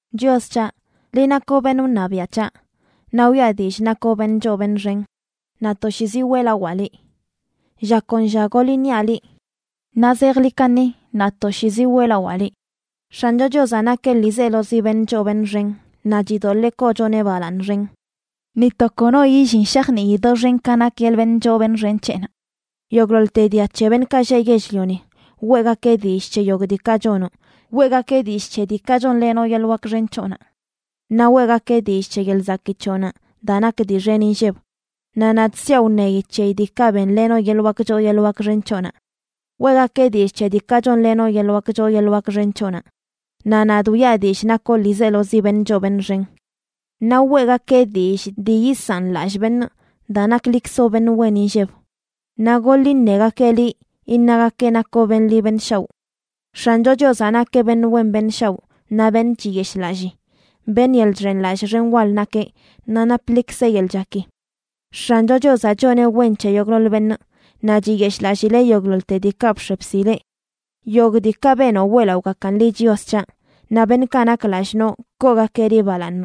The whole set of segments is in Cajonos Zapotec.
Chios c̱haꞌ, liꞌ nakoꞌ beṉꞌ wṉabiaꞌ c̱haꞌ, naꞌ wiꞌa dillꞌ nakoꞌ beṉꞌ choo beṉꞌ xen, naꞌ toshiizi weꞌlawaa liꞌ, Lla kon lla goḻ iṉiaꞌ liꞌ, naꞌ zejḻi kaṉi naꞌ toshiizi weꞌlawaa liꞌ. X̱ancho Chiozaꞌ nakeꞌ ḻiizelozi beṉꞌ choo beṉꞌ xen naꞌ chidoḻee koochoneꞌ balaaṉ xen. ¡Ni to kono illin shajnii doxen ka nak yeḻꞌ beṉꞌ choo beṉꞌ xen c̱heꞌnaꞌ! Yogꞌḻoḻte dia c̱he beṉꞌkaꞌ lleꞌ yell-lioni weꞌgakeꞌ dillꞌ c̱he yogꞌ diikaꞌ chonoꞌ; weꞌgakeꞌ dillꞌ c̱he diikaꞌ chonlenoꞌ yeḻꞌ wak xen c̱hoꞌnaꞌ. Naꞌ weꞌgakeꞌ dillꞌ c̱he yeḻꞌ zakii c̱hoꞌnaꞌ daa nak dii xen inlleb, naꞌ nadꞌ siaꞌ wṉeyi c̱heyi diikaꞌ benlenoꞌ yeḻꞌ wak choo yeḻꞌ wak xen c̱hoꞌnaꞌ. Weꞌgakeꞌ dillꞌ c̱he diikaꞌ chonlenoꞌ yeḻꞌ wak choo yeḻꞌ wak xen c̱hoꞌnaꞌ, naꞌ nadꞌ wiꞌa dillꞌ nakoꞌ ḻiizelozi beṉꞌ choo beṉꞌ xen. Naꞌ weꞌgakeꞌ dillꞌ dii yisaꞌn lallꞌ beṉꞌ daa naklikzoꞌ beṉꞌ wen inlleb, naꞌ goḻ iṉegakeꞌ liꞌ iṉagakeꞌ nakoꞌ beṉꞌ ḻi beṉꞌ shaoꞌ. X̱ancho Chiozaꞌ nakeꞌ beṉꞌ wen beṉꞌ shaoꞌ naꞌ beṉꞌ chiyeshꞌlallii. Beṉꞌ yeḻꞌ chxenlallꞌ xen wal nakeꞌ, naꞌ naplikzeꞌ yeḻꞌ chaki. X̱ancho Chiozaꞌ choneꞌ wen c̱he yogꞌḻoḻ beṉꞌ, naꞌ chiyeshꞌlallileꞌ yogꞌḻoḻte diikaꞌ bx̱e bsileꞌ. Yogꞌ diikaꞌ benoꞌ weꞌlaꞌogakan liꞌ, Chios c̱haꞌ; naꞌ beṉꞌkaꞌ nak lallꞌ noꞌ koogakeꞌ liꞌ balaaṉ.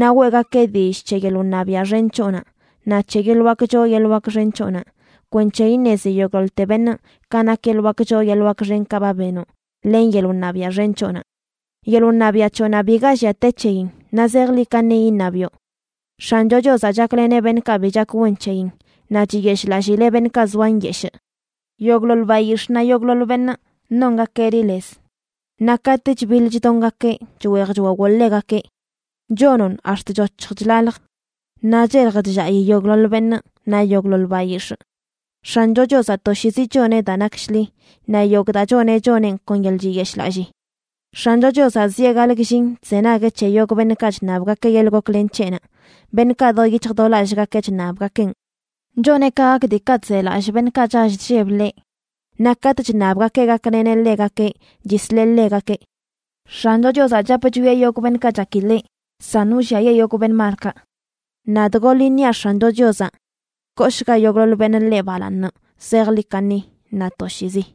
Naꞌ weꞌgakeꞌ dillꞌ c̱he yeḻꞌ wṉabiaꞌ xen c̱hoꞌnaꞌ, naꞌ c̱he yeḻꞌ wak choo yeḻꞌ wak xen c̱hoꞌnaꞌ, kwenc̱he iṉezi yogꞌḻoḻte beṉꞌ ka nak yeḻꞌ wak choo yeḻꞌ wak xenkaꞌ ba benoꞌ, len yeḻꞌ wṉabiaꞌ xen c̱hoꞌnaꞌ. Yeḻꞌ wṉabiaꞌ c̱hoꞌnaꞌ biga llia te c̱heyin; naꞌ zejḻi kaṉi iṉabiꞌo. X̱ancho Chiozaꞌ chakleneꞌ beṉꞌkaꞌ bi chak wen c̱heyin, naꞌ chiyeshꞌlallileꞌ beṉꞌkaꞌ zoa nyeshꞌ. Yogꞌḻoḻ bayix̱ꞌ naꞌ yogꞌḻoḻ beṉꞌ nongakeꞌ liꞌ lez, naꞌ katꞌ chbiḻ chdongakeꞌ, chweej chwawoꞌ ḻegakeꞌ. Chonoꞌn ax̱t chc̱hoc̱h chlalj, naꞌ chelj chllaꞌi yogꞌḻoḻ beṉꞌ naꞌ yogꞌḻoḻ bayix̱ꞌ. X̱ancho Chiozaꞌ toshiizi choneꞌ daa nak shḻi, naꞌ yogꞌ daa choneꞌ, choneꞌn kon yeḻꞌ chiyeshꞌlallii. X̱ancho Chiozaꞌ zieꞌ gaḻꞌ gllin chzenagueꞌ c̱he yogꞌ beṉꞌkaꞌ chṉabgakeꞌ yeḻꞌ goklen c̱heꞌnaꞌ, beṉꞌkaꞌ do yic̱hj do lallꞌgakeꞌ chṉabgakeꞌn. Choneꞌ ka gak diikaꞌ chzelallꞌ beṉꞌkaꞌ chall chlleb ḻeꞌ, naꞌ katꞌ chṉabgakeꞌ gakleneꞌ ḻegakeꞌ, chisleꞌ ḻegakeꞌ. X̱ancho Chiozaꞌ chap chwieꞌ yogꞌ beṉꞌkaꞌ chaki ḻeꞌ, san wlliayee yogꞌ beṉꞌ malkaꞌ. Nadꞌ goḻ iṉiaꞌ X̱ancho Chiozaꞌ. ¡Kooshga yogꞌḻoḻ beṉꞌ ḻeꞌ balaaṉ zejḻi kaṉi naꞌ toshiizi!